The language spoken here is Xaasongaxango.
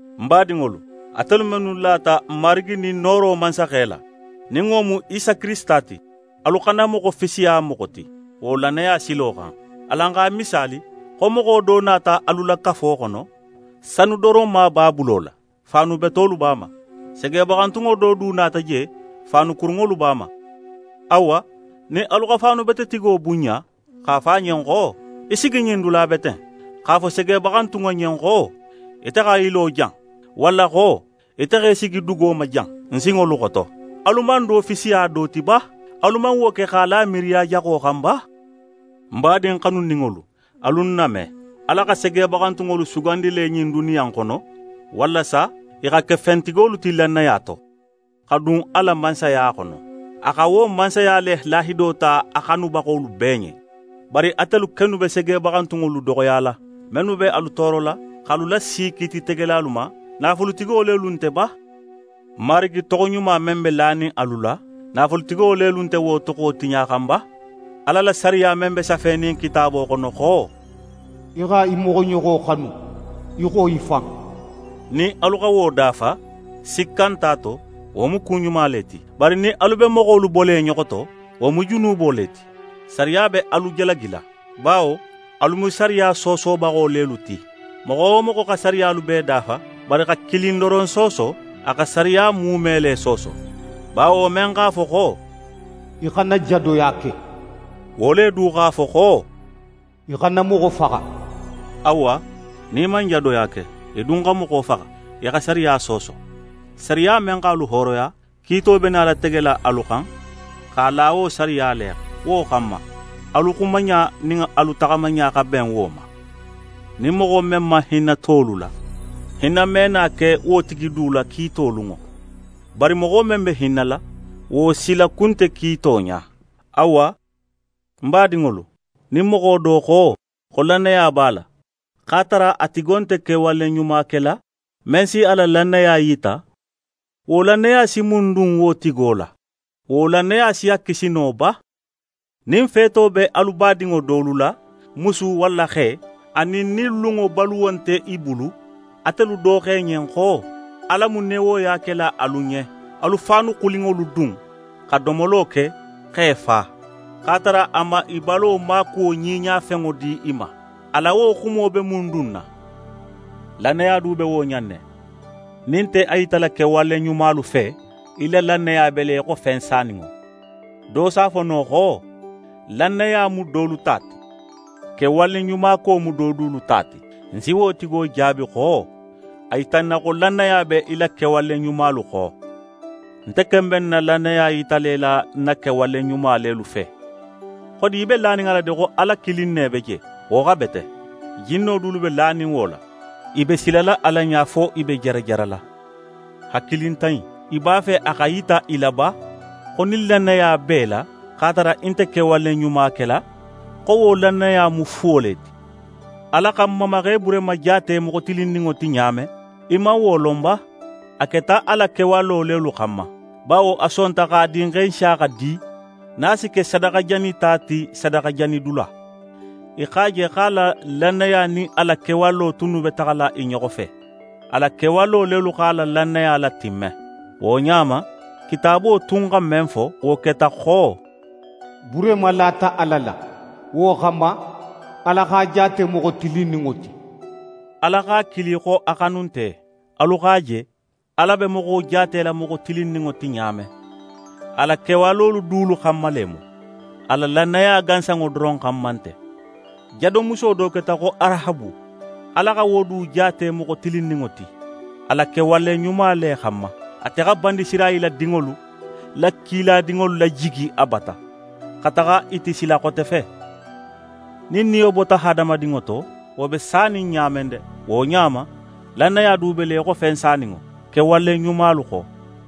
Ń badinŋolu, atelu mennu lata n Marigi nin nooro Mansaxe la, nin wo mu Isa Kirisita ti, alu xana moxo fisiya moxo ti, wo lannaya silo xan. Alan x'a misaali xo moxo do nata alu la kafo xono, sanudoronma b'a bulo la, faanu betolu be a ma. Segebaxantunŋo do du nata je, faanu kurunŋolu be a ma. Awa, nin alu xa faanubetetigo bunɲa x'a fo a ɲen xo: «Í sigi ɲin dula bete in», x'a fo segebaxantunŋo ɲen xo: «Ite xa í lo jan!» walla xo: «Ite xa í sigi dugo ma jan, ń sinŋolu xoto», alu man do fisiya do ti ba? Alu man wo ke x'a la miiriya jaxo xan ba? Ń badin xanuninŋolu, alu ń name! Ala xa segebaxantunŋolu sugandi le ɲin duniya in xono, walasa i xa ke fentigolu ti lannaya to, xa dun a la Mansaya xono. A xa wo Mansaya le lahido ta a xanubaxolu bee ɲen. Bari atelu kennu be segebaxantunŋolu doxoyala. Mennu be alu toorola, x'alu lasi kiititegelalu ma, naafulutigo lelu nte ba? Marigi toxoɲuma men be lanin alu la, naafulutigo lelu nte wo toxo tiɲaxan ba? Ala la sariya men be safenin Kitaabo xono xo: «Í xa í moxoɲoxo xanu í xo í fan», nin alu xa wo dafa, sikka nte a to, wo mu ku ɲuma le ti. Bari nin alu be moxolu bola i ɲoxo to, wo mu junubo le ti. Sariya be alu jalagila; bawo alu mu sariya soosobaxo lelu ti. Moxo wo moxo xa sariyalu bee dafa, bari xa kilin doron sooso, a xa sariya muume le sooso. Bawo men x'a fo xo: «Í xana jadoya ke,» wo le du x'a fo xo: «Í xana moxo faxa.» Awa, nin í man jadoya ke, í dun xa moxo faxa, í xa sariya sooso. Sariya men x'alu hooroya, kiito be nala tegela alu xan, x'a la wo sariya le xan. Wo xanma, alu xumaɲa nin alu taxamaɲa xa ben wo ma. Nin moxo men man hinna tolu la, hinna me na ke wo tigi du la kiito lunŋo. Bari moxo men be hinnala, wo silakun nte kiito ɲa. Awa, ń badinŋolu, nin moxo do xo, xo lannaya b'a la, x'a tara a tigo nte kewale ɲuma kela, men si a la lannaya yita, wo lannaya si mun dun wo tigo la? Wo lannaya si a kisi no ba? Nin feeto be alu badinŋo dolu la, musu walla xe, anin nin lunŋo baluwo nte i bulu, atelu do xo i ɲen xo: «Ala mu newoya kela alu ɲen. Alu faanu xulinŋolu dun, xa domolo ke x'e fa», x'a tara a man i balo maakuwo ɲiɲafenŋo di i ma, a la wo xumo be mun dunna? Lannaya du be wo ɲa in ne. Nin í nte a yitala kewale ɲumalu fe, í la lannaya be le í xo fen saninŋo. Do si a fo no xo: «Lannaya mu dolu ta ti, kewaleɲumako mu do dulu ta ti.» Ń si wo tigo jaabi xo: «A yita ń na xo lannaya be í la kewale ɲumalu xo. Nte ken be ń na lannaya yitala í la ń na kewale ɲuma lelu fe.» Xodi í be lanin a la de xo Ala kilin ne be je? Wo xa bete. Jinno dulu be lanin wo la. I be silala Ala ɲa fo i be jarajarala. Hakilintan in! Í b'a fe a xa yita í la ba xo nin lannaya b'é la x'a tara í nte kewale ɲuma kela, xo wo lannaya mu fuwo le ti? Ala xa n mamaxe Burehima jaate moxo tilinninŋo ti ɲa men, í man wo lon ba? A keta a la kewalo lelu xanma, bawo a sonta x'a dinxe Nsiyaxa di nin a si ke sadaxajanita ti sadaxajanidula. Í x'a je xo a la lannaya nin a la kewalolu tunnu be taxala i ɲoxo fe. A la kewalo lelu x'a la lannaya latimme. Wo ɲa ma, Kitaabo tun xa men fo, wo keta xo: «Burehima lata Ala la, wo xanma, Ala x'a jaate moxo tilinninŋo ti.» Ala x'a kili xo a xanunte. Alu x'a je, Ala be moxo jaatela moxo tilinninŋo ti ɲa men. A la kewalolu dulu xanma le mu, a la lannaya gansanŋo doron xanma nte. Jadomuso do keta xo Arahabu, Ala xa wo du jaate moxo tilinninŋo ti a la kewale ɲuma le xanma. Ate xa Banisirayila dinŋolu la kiladinŋolu lajigi a bata, xa taxa i ti sila xote fe. Nin niyo bota hadamadinŋo to, wo be sanin ɲa men de, wo ɲa ma, lannaya du be le í xo fen saninŋo, kewale ɲumalu xo.